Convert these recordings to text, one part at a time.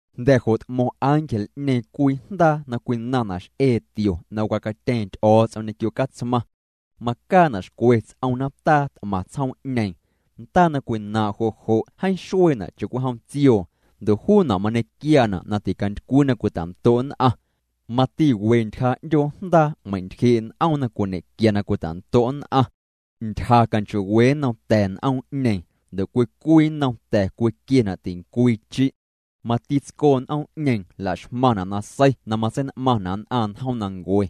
Jnda̱ jo' t'mo̱ⁿ ángel'ñeeⁿ cwii jndaa na cwinaⁿna' x'ee tio na wacatyeeⁿ Ty'o̱o̱ts'om ñequio Catsmaⁿ. Macaana' xcwe ts'om nataa t'maⁿ tsjoom'ñeeⁿ. Ndaa na cwinaaⁿ' jo' jo' jeeⁿ xueena' cha'cwijom tsioo ndo' juuna' mañequiaana' na ticantycwii na cwita'ndo' nn'aⁿ. Mati we ntyja 'ndyoo jndaa meintyjee' n'oom na cwiñe'quia na cwita'ndo' nn'aⁿ. Ntyja canchoo'we nnom ta̱ n'oom'ñeeⁿ, ndo' cwii cwii nnom ta̱ cwiquiena' tincwii chi'. Mati tscoo n'oom'ñeeⁿ la'xmaⁿna' nasei na matsein'maⁿna' nn'aⁿ njoomnancue.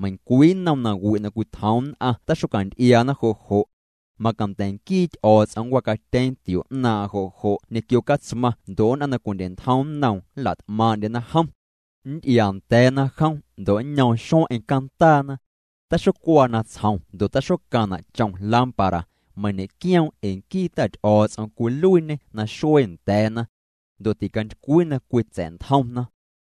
Meiⁿcwii nnom nawi' na cwitjoom nn'aⁿ taxocanty'iaana jo' jo'. Macanda̱ nquii Ty'o̱o̱ts'om nncwacatyeeⁿ tio 'naaⁿ'aⁿ jo' jo' ñequio Catsmaⁿ ndo' nn'aⁿ na cwindye'ntjom nnoom nla't'maaⁿ'ndyena jom. Nnty'iaanda̱a̱na jom ndo' nñoom xueⁿ'eⁿ cantaana. Taxocuaa natsjom ndo' taxocaⁿna' chom lámpara, meiⁿ ñe'quioom' ee nquii Ta Ty'o̱o̱ts'om cwiluiiñê naxuee nda̱a̱na. Ndo' ticantycwii na cwitsa̱'ntjomna.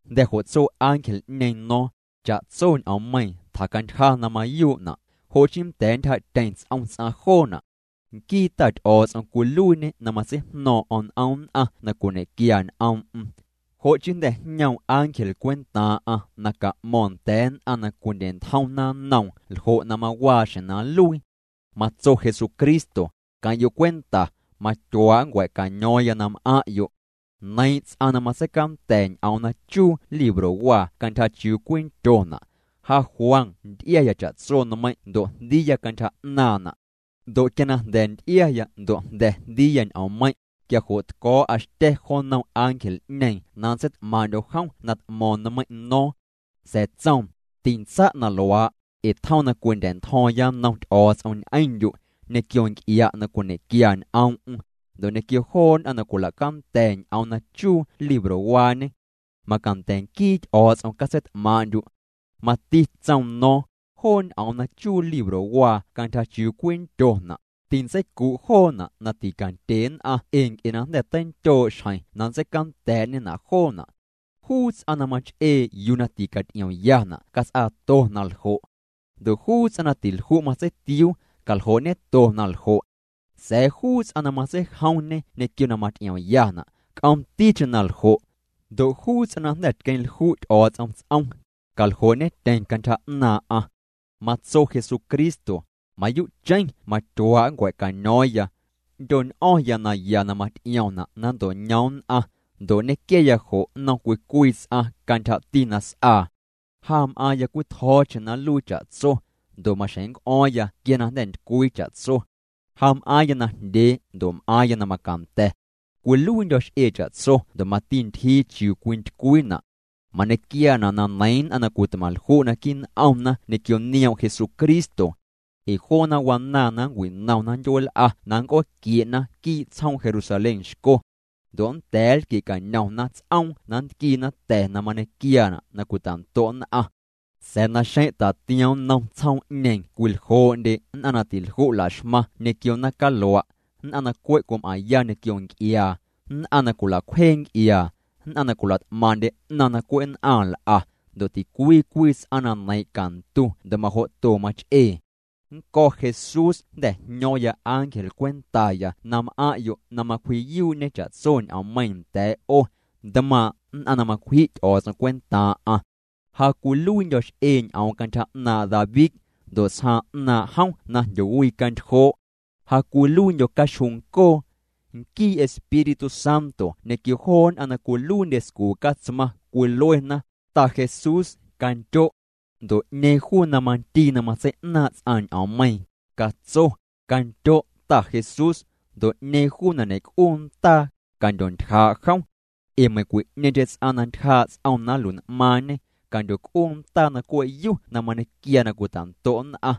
Jnda̱ jo' tso ángel'ñeeⁿ no̱o̱ⁿ: —Cha'tso ñ'oommeiiⁿ tjacantyja na mayuu'na', jo chii nnda̱a̱ ntyjaa'tyeⁿ ts'om ts'aⁿ joona'. Nquii Ta Ty'o̱o̱ts'om cwiluiiñê na matseijno̱o̱ⁿ'o̱ⁿ n'om nn'aⁿ na cwiñe'quia ñ'oom'm. Jo' chii jnda̱ jñoom ángel cwentaaⁿ'aⁿ na ca'mo̱ⁿ nda̱a̱ nn'aⁿ na cwindye'ntjomna nnoom ljo' na mawaaxjeⁿ na nluii. Matso Jesucristo: —Queⁿ'yo' cwenta, matyuaa' nncua̱'caño̱o̱ⁿya na m'aⁿ'yo'. Neiiⁿ' ts'aⁿ na matseicanda̱ ñ'oom na chuu librowaa cantyja chiuu cwindyona'. Ja Juan nty'iaya cha'tso nmeiⁿ' ndo' jndiiya cantyja 'naaⁿna'. Ndo' quia na jnda̱ nty'iaya ndo' jnda̱ jndiiya ñ'oommeiⁿ', quia jo' tco̱o̱'a xtya̱ jo nnom ángel'ñeeⁿ na nntseit'maaⁿ'ndyo̱ jom na t'mo̱o̱ⁿ nmeiⁿ' no̱o̱ⁿ. Sa̱a̱ tsoom: —Tintsa' na luaa', ee tjom na cwindya̱'ntjo̱o̱ⁿya nnom Ty'o̱o̱ts'om ñ'eⁿndyu', ñequio nc'ia' na cwiñe'quia ñ'oom'm, ndo' ñequio joo nn'aⁿ na cwila'canda̱ ñ'oom na chuu librowaañe. Macanda̱ nquii Ty'o̱o̱ts'om catseit'maaⁿ'ndyu'. Mati tsoom no̱o̱ⁿ: —Joo ñ'oom na chuu librowaa cantyja chiuu cwindyona', tintseicu' joona' na ticandye nn'aⁿ ee nc'e na jnda̱ teinndyoo' xjeⁿ na nntseicanda̱a̱'ñena' joona'. Juu ts'aⁿ na mach'ee yuu na ticaty'iomyana' cats'aato na ljo'. Ndo' juu ts'aⁿ na tilju' matseitiuu, caljoo'ñeto na ljo'. Sa̱a̱ juu ts'aⁿ na matseijomñe ñequio na maty'iomyana', c'oomticheⁿ na ljo'. Ndo' juu ts'aⁿ na jnda̱ tqueⁿlju' Ty'o̱o̱ts'om ts'om, caljoo'ñetyeⁿ cantyja 'naaⁿ'aⁿ. Matso Jesucristo: —Mayuu'cheⁿ matyuaa' nncua̱'caño̱o̱ⁿya. Nndyo̱ñ'o̱ⁿya naya na maty'iomna' na nnto'ñoom nn'aⁿ, ndo' nñequiaya jo' nnom cwii cwii ts'aⁿ cantyjati na s'aa. Ja m'aaⁿya cwitjo̱o̱cheⁿ na nluii cha'tso, ndo' maxjeⁿ nnc'o̱o̱ⁿya quia na jnda̱ ntycwii cha'tso. Ja m'aaⁿya najndyee ndo' m'aaⁿya na macanda̱. Cwiluiindyo̱ x'ee cha'tso ndo' mati ntyjii chiuu cwintycwiina'. Mañequiaana' na neiiⁿ nn'aⁿ na cwitmaⁿlju' naquii' n'omna ñequio nioom' Jesucristo. Ee joona wanaaⁿ na nncwinomna ndyueel'a na nnc'ooquie'na quii' tsjoom Jerusalén xco. Ndo' nnda̱a̱ nlquie'cañomna ts'oom na nntquiina ta̱ na mañequiaana' na cwita'ndo' nn'aⁿ. Sa̱a̱ naxeⁿ' tatiom nnom tsjoom'ñeeⁿ cwiljoo'ndye nn'aⁿ na tilju' laxmaⁿ ñequio naⁿcalua', nn'aⁿ na cwe' cwim'aⁿya ñequio nc'iaa, nn'aⁿ na cwila'cwjee nc'iaa, nn'aⁿ na cwila't'maaⁿ'ndye 'naⁿ na cwe' nn'aⁿ nl'a, ndo' ticwii cwii ts'aⁿ na neiiⁿ' cantu ndo' majo'to mach'ee. —Nnco̱ Jesús jnda̱ jño̱o̱ⁿya ángel cwentaya na m'aⁿ'yo' na macwji'yuu'ñe cha'tso ñ'oommeiiⁿ nda̱a̱' 'o, ntmaaⁿ' nn'aⁿ na macwji' Ty'o̱o̱ts'om cwentaaⁿ'aⁿ. Ja cwiluiindyo̱ x'ee ñ'oom cantyja 'naaⁿ' David, ndo' tsjaaⁿ 'naaⁿ' jom na jndyowicantyjoo'. Ja cwiluiindyo̱ caxjuuncoo. Nquii Espíritu Santo ñequio joo nn'aⁿ na cwiluiindye scuu' Catsmaⁿ cwiluena: —Ta Jesús, candyo'. Ndo' 'ñeeⁿ juu na mandii na matsei'naaⁿ' ts'aⁿ ñ'oommeiiⁿ, catso: —Candyo', Ta Jesús. Ndo' 'ñeeⁿ juu na ñe'c'uu ndaa, candyontyjaa' jom. Ee meiⁿcwi'ñeeⁿcheⁿ ts'aⁿ na ntyjaa' ts'om na nlui'n'maaⁿñe, candyoc'uu ndaa na cwe'yu na mañequiaa na cwita'ndo' nn'aⁿ.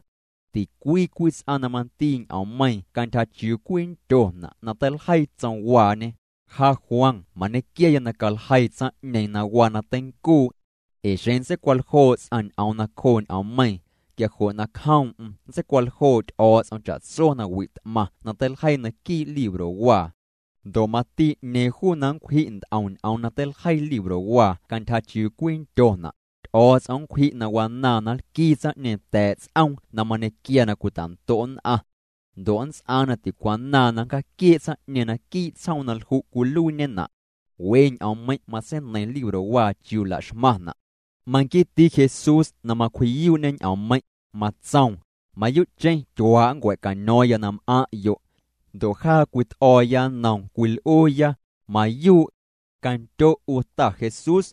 Ticwii cwii ts'aⁿ na mandii ñ'oommeiiⁿ cantyja chiuu cwindyona' na teiljeii tsomwaañe, ja Juan mañequiaya na caljeii tsaⁿ'ñeeⁿ na waa na teincuu'. Ee xeⁿ nntseicwaljoo' ts'aⁿ ñ'oom nacjoo' ñ'oommeiiⁿ, quia jo' nacjoom'm nntseicwaljoo' Ty'o̱o̱ts'om cha'tso nawi' t'maⁿ na teiljeii naquii' librowaa. Ndo' mati 'ñeeⁿ juu na nncwji' nt'om ñ'oom na teiljeii librowaa cantyja chiuu cwindyona', Ty'o̱o̱ts'om nncwji' na wanaaⁿ na nlquii tsaⁿ'ñeeⁿ ta̱a̱' ts'oom na mañequiaa na cwita'ndo' nn'aⁿ. Ndo' nnts'aaⁿ na ticwanaaⁿ na nncjaaquiee' tsaⁿ'ñeeⁿ naquii' tsjoom na lju' cwiluiiñena'. We ñ'oommeiⁿ' matseineiⁿ librowaa chiuu la'xmaⁿna'. Manquiiti Jesús na macwji'yuu'ñe ñ'oommeiⁿ', matsoom: —Mayuu'cheⁿ tyuaa' nncua̱'caño̱o̱ⁿya na m'aⁿ'yo'. Ndo' jaa cwit'o̱o̱ya nnoom, cwil'uuya: —Mayuu'. Candyo' 'u Ta Jesús.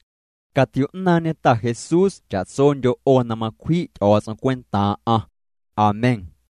Catio'naaⁿñe Ta Jesús cha'tsondyo' 'o na macwji' Ty'o̱o̱ts'om cwentaaⁿ'aⁿ. Amén.